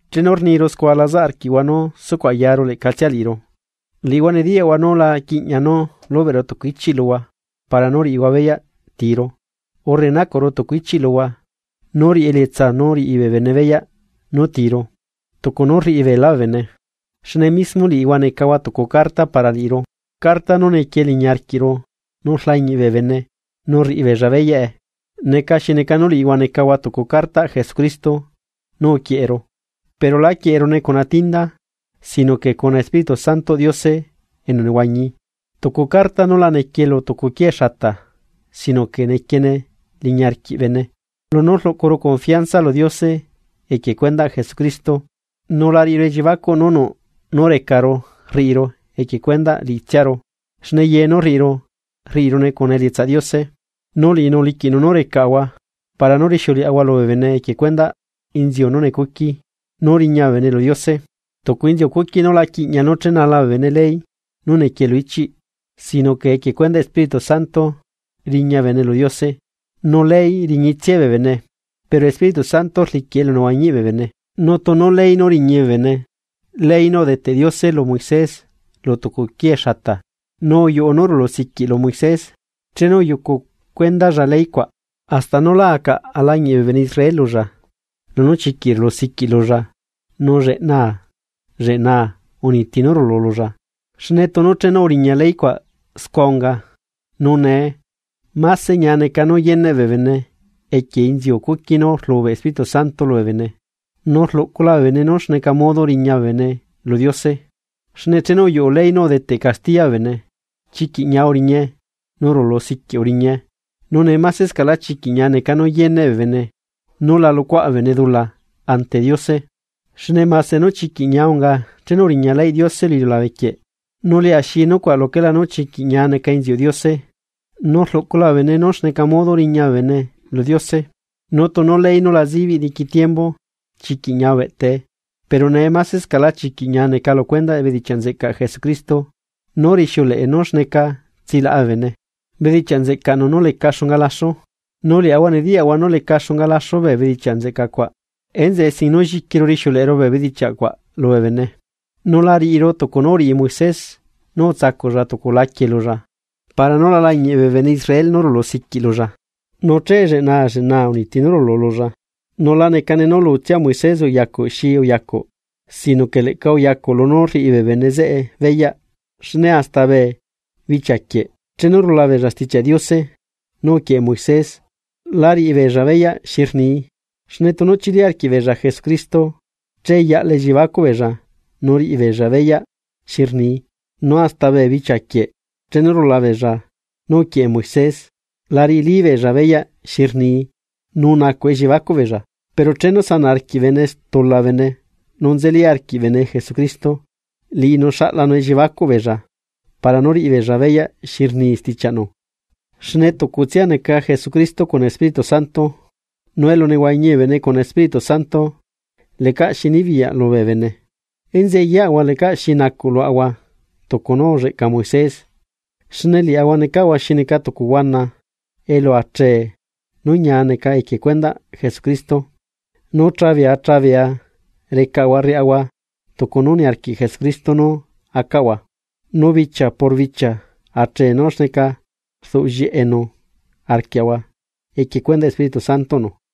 Chenu rniru scua lazaꞌ arquiꞌhua nú sucuꞌ ayaru leꞌcatsia liꞌiru. Liꞌihua nediyaꞌhua nú la quiꞌña nú lubeꞌru tucu ichiꞌ luhua para nú riꞌihua beyaꞌ tiru, urre nacuꞌru tucu ichiꞌ luhua nú riꞌi elietsa nú riꞌi bee bene beyaꞌ nú tiru, tucu nú rriꞌi beelá bee bene. Xne mismo liꞌihua necahua tucu carta para liꞌiru, carta nú nequie liñi arquiꞌru nú rlañiꞌ bee bene nu rriꞌi beella beyaꞌe. Neca xi neca nú liꞌihua necahua tucu cartaꞌ Jesucristo nú uquieꞌeru, pero lá quieꞌerune cuna tinda, sino que cuna Espíritu Santoꞌ Diose enu nehuañi, tucu carta nú la nequie lu tucu quiee xata sino que nequiene liñi arquiꞌ bene. Lunú rluꞌcuru confianza lu Diose equie cuendaꞌ Jesucristo, nu la riꞌiru elliebacuꞌ nú nuꞌ nú recaru rriꞌiru equie cuendaꞌ liꞌitsiaru xne ye nú rriꞌiru, rriꞌirune cuna elietsaꞌ Diose. Nu liꞌinu uliquiꞌnu nú recaꞌahua para nú rixiuleꞌahua lubee bene equie cuendaꞌ inziu nú necuqui, nú riña bee bene lu Diose, tucu inziu cuqui nú la quiꞌña chenala bee bene ley nú nequie lu ichiꞌ, sino que equie cuendaꞌ Espíritu Santo riña bene lu Diose. Nu ley riñitsiae bee bene, pero Espíritu Santo rliquiꞌ elunehuañiꞌ bee bene. Nu tunu ley nú riñi bee bene, ley nú udeteꞌ Diose lu Moisés lu tucu quiee xata, nu uyuꞌu nú rulu siquiꞌ lu Moisés chenu uyucu cuendalla ley cuaꞌ, hasta nú lá acaꞌ alañiꞌ bee bene Israel lulla lunú chiquiꞌ rulu siquiꞌ lulla nu lleꞌna lleꞌnaa uniti nú rulu lulla. Xne tunu chenu uriña ley cuaꞌ scua unga, nu nee. ¡Mase ñia neca nú yeneꞌ bee bene equie inziu cuqui nú rlubeꞌ Espíritu Santo lubee bene, nu rluꞌcula bee bene nú xa modo riña bee bene lu Diose! Xne chenu uyuꞌu ley nú udeteꞌ castiya bee bene, chiquiꞌ ñia uriñae nu rulu siquiꞌ uriñae, nu nee masescaꞌlá chiquiꞌ ñia neca nú yeneꞌ bee bene nú la luꞌcuaꞌ bee bene dula ante Diose. Xne mase nú chiquiꞌ ñia unga chenu uriña leyꞌ Diose lu iliulabe quieꞌ, nu lia xi nucuaꞌ luquelá nú chiquiꞌ ñia neca inziuꞌ Diose nú rluꞌcula bee bene nú xneca modo riña bee bene lu Diose. Nu tunu ley nú la zibiꞌ diqui tiembu chiquiꞌ ñia ubeꞌtae, pero nee masescaꞌlá chiquiꞌ ñia neca lu cuendaꞌ bedichiaꞌ nzeꞌcaꞌ Jesucristo nú rixiuleꞌe nú xneca tsilaꞌa bee bene, bedichiaꞌ nzeꞌcaꞌnu nú lecaꞌ xunga laxu. Nu liaꞌahua nediyaꞌahua nú leca xunga laxu bee bedichiaꞌ nzeca cua, enzeꞌe sin nú lliquiru rixiuleꞌeru bee bedichiaꞌ cuaꞌ lubee bene. Nu la riꞌiru tucu nú uriꞌi Moisés nú utsacuꞌlla tucu laquie lulla para nú la lañiꞌ bee bene Israel nú rulu siquiꞌ lulla, nu che lleꞌnaa lleꞌnaa uniti nú rulu lulla. Nu la neca nú lutsia Moisés uyacuꞌ xi uyacuꞌ, sino que leꞌca uyacuꞌ lunú rriꞌi bee bene zeꞌe beyaꞌ. Xne hasta bee bichia quieꞌ chenu rula beella Stichiaꞌ Diose nú uquieꞌe Moisés la riꞌi beella beyaꞌ xi rnii, xne tunu chili arquiꞌbeella Jesucristo che yaꞌla elliebacuꞌ beella nu riꞌi beella beyaꞌ xi rnii. Nu hasta bee bichia quieꞌ chenu rula beella nú uquieꞌe Moisés, la riꞌili beella beyaꞌ xi rnii nu nacuꞌ elliebacuꞌ beella. Pero chenu sanaꞌ arquiꞌ bene stula bene nu nzeli arquiꞌ bene Jesucristo liꞌinu xaꞌlanu elliebacuꞌ beella para nú riꞌi beella beyaꞌ xi rni stichiaꞌnu. Xne tucutsia neca Jesucristo cuna Espíritu Santo, nu elu nehuañi bee bene cuna Espíritu Santo lecaꞌ xi nibiyaꞌ lubee bene. Enzeꞌe yeꞌahua lecaꞌ xi nacuꞌ luaꞌahua tucu nú ulleꞌca Moisés, xne liaꞌahua necaꞌahua xi neca tucu huana elu achee nú ñia neca equie cuendaꞌ Jesucristo. Nu chabea chabea recaꞌahua rriaꞌahua tucu nú niarquiꞌ Jesucristo nú acaꞌahua, nu bichia por bichia achee nú xneca rduꞌ llieꞌenu arquiaꞌahua equie cuendaꞌ Espíritu Santoꞌnu.